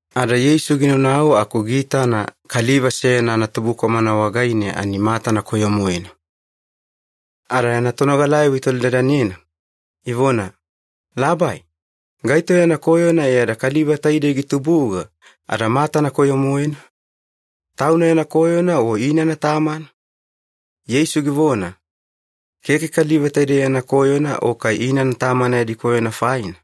Ada Yeisu ginaunau aku giitana kaliva seyana anatubukwamana wagaine ani matana koyo-moena. Ada yana tonogalayavo itolidadanena, ivona, “Labai, gaito yana koyona e ada kaliva taidei gitubuga ada matana koyo-moena? Tauna yana koyona o inana tamana?” Yeisu givona, “Keke kaliva taidei yana koyona o kai inana tamana yadi koyona faina,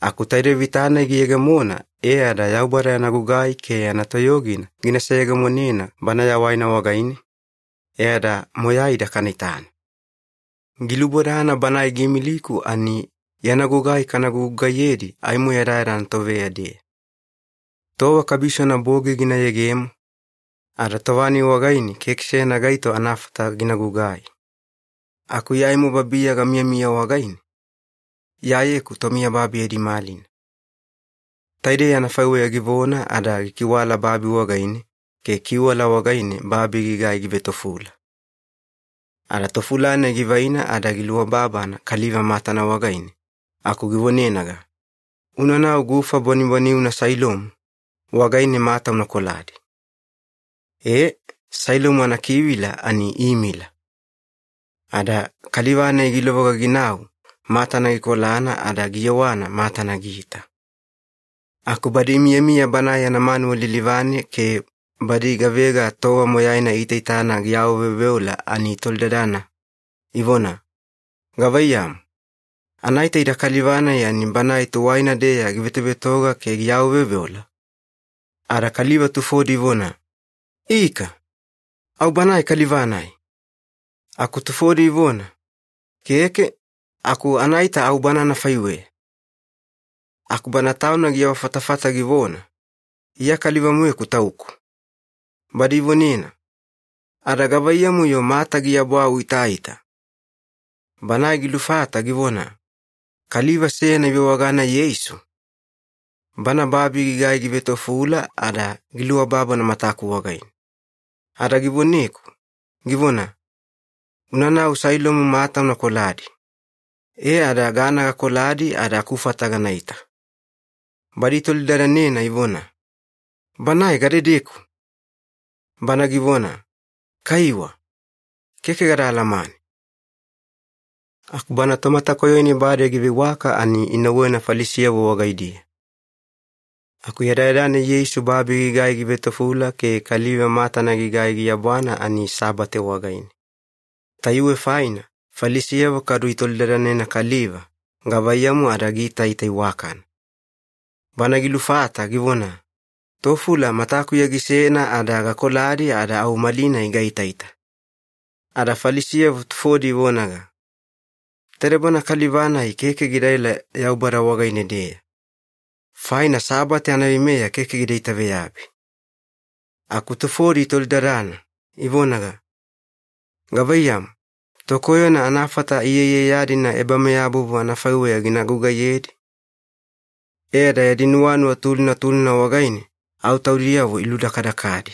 aku taidei vita-nai giyegemona e ada Yaubada yana gugai ke yana toyogina gina seyegemonena bana yawaina wagaine, e ada moyaida kana itana. Gilubodana Banae giimiliku ani yana gugai kana gugugaiyedi aimo yadayada anatoveya-deya. Tova kabisona bogi gina yegemo, ada tova-nai wagaine keke seyana gaito anafata gina gugai. Aku Iya aimo babiya gamiyamiya wagaine, Iyayeku tomiyababi yadi malina.” Taidei anafaiweya givona ada gikiwala babi wagaine ke kiwala wagaine babi gigai givetofula. Ada tofula-nai givaina ada giluababana kaliva matana wagaine aku givonenaga, “Unanau gufa bwanibwaniuna Sailomu wagaine mata una koladi.” E, ‘Sailomu’ anakivila ani ‘imila’. Ada kaliva-nai gilovoga ginau matana gikolana ada giyewana matana giita. Aku badi imiyamiya banae yana manuwa lilivane ke badi gavega tova moyaina iitaitana giawaveoveola ani itolidadana ivona, “Gavaiyamu, anaita ida kaliva-nai ani banae tuwaina-deya givetovetoga ke giawaveoveola?” Ada kaliva tufodi ivona, “Ika, au banae kaliva-nai!” Aku tufodi ivona, “Keke, aku anaita au bana anafaiweya.” Aku bana tauna giawafatafata givona, “Iya kaliva-moeku tauku.” Badi ivonena, “Ada gavaiyamu-yo mata giabwa uitaita?” Banae gilufata givona, “Kaliva seyana ivewagana Yeisu, Bana babi gigai givetofula ada giluababana mataku wagaine. Ada givoneku, givona, ‘Unanau Sailomu mata una koladi.’ E ada gana gakoladi ada akufata ganaita.” Badi itolidadanena ivona, “Banae gadedeku?” Bana givona, “Kaiwa, keke gada alamane.” Aku bana tomatakoyo-nai bade giveiwaka ani inauwena Falisiyavo wagaidiya. Aku yadayada-nai Yeisu babi gigai givetofula ke kaliva matana gigai giabwana ani Sabate wagaine. Tayuwe faina Falisiyavo kadu itolidadanena kaliva gavaiyamu ada giitaita iwakana. Bana gilufata givona, “Tofula matakuya gisena ada gakoladi ada au malinai gaitaita.” Ada Falisiyavo tufodi ivonaga, “Taide bana kaliva-nai keke gidaela Yaubada wagaine-deya, faina Sabate anaveimeya keke gida itaveyabi.” Aku tufodi itolidadana, ivonaga, “Gavaiyamu, tokoyona anafata iyaiyaya-dina ebameyabovu anafaiweya gina gugaiyedi?” E ada yadi nuwanuwa tulina tulina wagaine au taudiyavo iludakadakadi.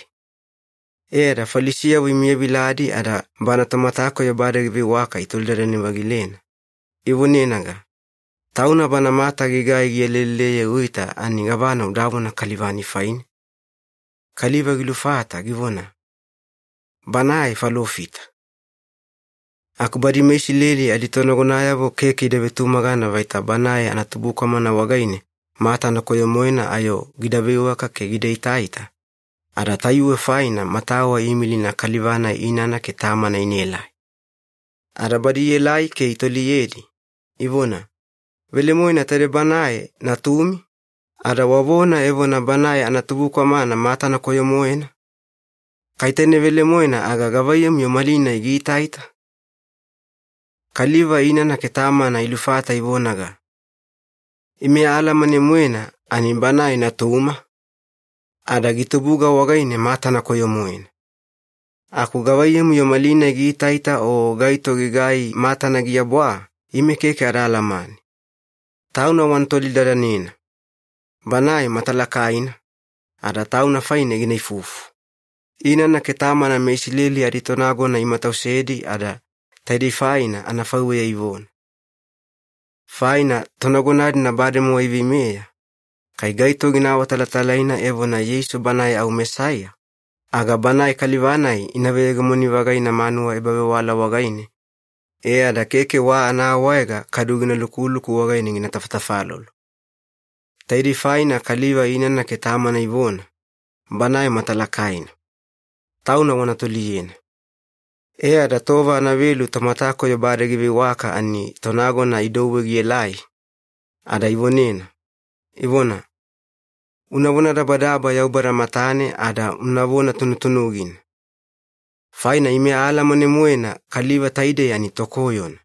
E ada Falisiyavo imiyaviladi ada bana tomatakoyo bade giveiwaka itolidadane-vagilena, ivonenaga, “Tauna bana mata gigai gialeleleye uita ani gavana udavona kaliva-nai faine?” Kaliva gilufata givona, “Banae falofita.” Aku badi meIsileli aditonagonayavo keke ida vetumagana vaita banae anatubukwamana wagaine matana koyo-moena ayo gida veiwaka ke gida itaita, ada tayuwe faina matawa iimilina kaliva-nai inana ke tamana inaelai. Ada badi ielai ke itoliyedi, ivona, “Velemoena taidei banae natumi, ada wavona evona banae anatubukwamana matana koyo-moena? Kai taine velemoena aga gavaiyamu-yo malinai giitaita?” Kaliva inana ke tamana ilufata ivonaga, “Ime aalamane-moena ani banae natuma, ada gitubuga wagaine matana koyo-moena. Aku gavaiyamu-yo malinai giitaita o gaito gigai matana giabwa, ime keke ada alamane. Tauna wana tolidadanena. Banae matalakaina, ada tauna faine gina ifufu.” Inana ke tamana meIsileli aditonagona imatausedi ada taidei faina anafaiweya ivona. Faina tonagona-dina bademowa iveimeya, kai gaito gina awatalatalaina evona Yeisu Banae au Mesaiya, aga banae kaliva-nai ina veyegemoni-vagaina manuwa ebavewala wagaine e ada keke wa anaawaega kadu gina lukuluku wagaine gina tafatafalolo. Taidei faina kaliva inana ke tamana ivona, “Banae matalakaina. Tauna wana toliyena.” E ada tova anavelu tomatakoyo bade giveiwaka ani tonagona idouwe gielai, ada ivonena, ivona, “Una vonadabadaba Yaubada matane ada unavona tunutunugina. Faina ime aalamane-moena kaliva taidei ani tokoyona.”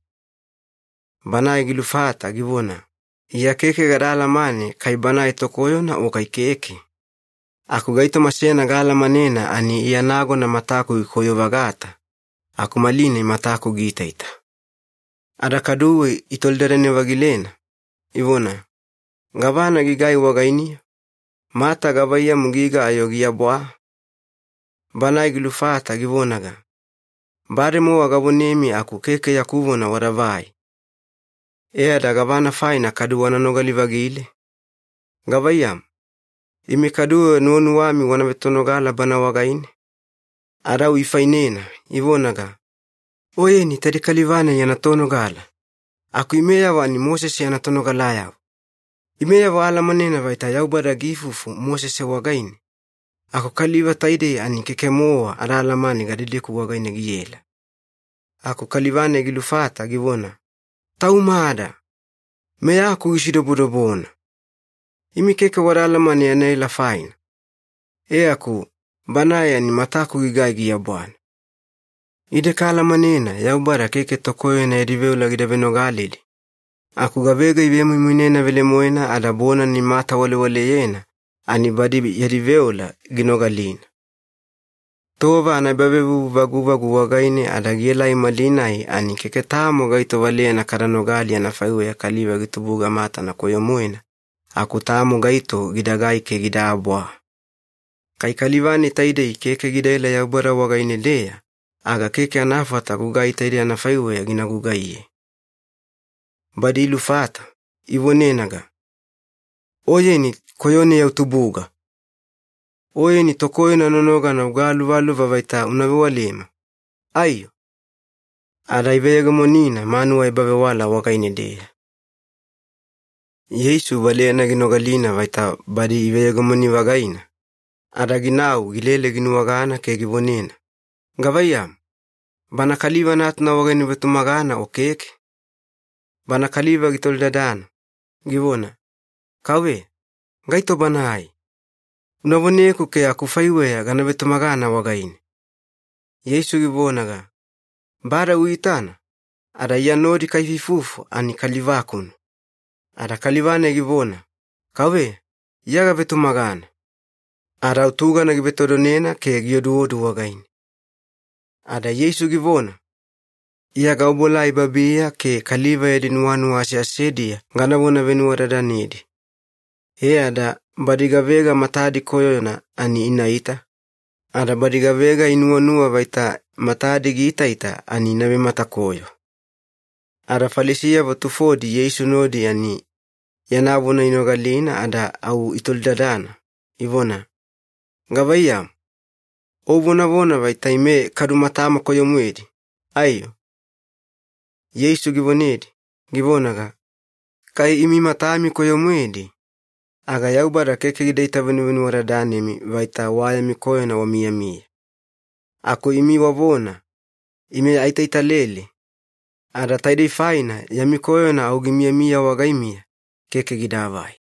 Banae gilufata givona, “Iya keke gada alamane kai banae tokoyona o kai keke. Aku gaitoma seyana gaalamanena ani Iya nagona mataku gikoyo-vagata, aku malinai mataku giitaita.” Ada kaduwe itolidadane-vagilena, ivona, “Gavana gigai wagainiya? Mata gavaiyamu giga ayo giabwa?” Banae gilufata givonaga, “Bademowa gavonemi aku keke yaku vona wadavai. E ada gavana faina kadu wana nogali-vagile? Gavaiyamu, imi kaduwe nuwanuwami wana vetonogala Bana wagaine?” Ada au ifainena, ivonaga, “Oyeni taidei kaliva-nai yana tonogala, aku imeyavo ani Mosese yana tonogalayavo! Imeyavo aalamanena vaita Yaubada giifufu Mosese wagaine, aku kaliva taidei ani keke-mowa ada alamane gadedeku wagaine giela.” Aku kaliva-nai gilufata givona, “Taumada! Meyaku gisidobodobona! Imi keke wada alamane yana ela faina, e aku Banae ani mataku gigai giabwana. Ide kaalamanena Yaubada keke tokoyona yadi veola gida venogaledi, aku gavega ivemoimoinena velemoena ada bonana imatawalewaleyena ani badi yadi veola ginogalina. Tova anaebavevuvu vaguvagu wagaine ada gielai malinai ani keke tamo gaito valeyana kada nogali anafaiweya kaliva gitubuga matana koyo-moena aku tamo gaito gidagai ke gidaabwa. Kai kaliva-nai taidei keke gidaela Yaubada wagaine-deya, aga keke anafata gugai taidei anafaiweya gina gugaiye.” Badi ilufata, ivonenaga, “Oyeni koyoneya utubuga! Oyeni tokoyona nonogana ugaluvaluva vaita una vewalema, aiyo!” Ada iveyegemonina manuwa ebavewala wagaine-deya. Yeisu valeyana ginogalina vaita badi iveyegemoni-vagaina, ada ginau gilele ginuwagana ke givonena, “Gavaiyamu, Bana Kaliva Natuna wagaine uvetumagana o keke?” Bana kaliva gitolidadana, givona, “Kauveya, gaito Banae? Una voneku ke akufaiweya gana vetumagana wagaine.” Yeisu givonaga, “Bade uitana, ada Iya nodi kaifuifufu ani kaliva-kuna.” Ada kaliva-nai givona, “Kauveya, Iya gavetumagana.” Ada au tugana givetodonena ke gioduodu wagaine. Ada Yeisu givona, “Iya gaobuelai babiya ke kaliva yadi nuwanuwa aseasediya ganavona venuwadadanedi. E ada badi gavega matadi koyona ani inaita, ada badi gavega inuwanuwa vaita matadi giitaita ani ina vematakoyo.” Ada Falisiyavo tufodi Yeisu nodi ani yana vona inogalina ada au itolidadana, ivona, “Gavaiyamu, o uvonavona vaita ime kadu matama koyo-moedi, aiyo?” Yeisu givonedi, givonaga, “Kai imi matami koyo-moedi, aga Yaubada keke gida itavenuvenuwadadanemi vaita wa yami koyona wamiyamiya. Aku imi wavona, ‘Ime aitaitalele,’ ada taidei faina yami koyona au gimiyamiya wagaimiya, keke gidaavai.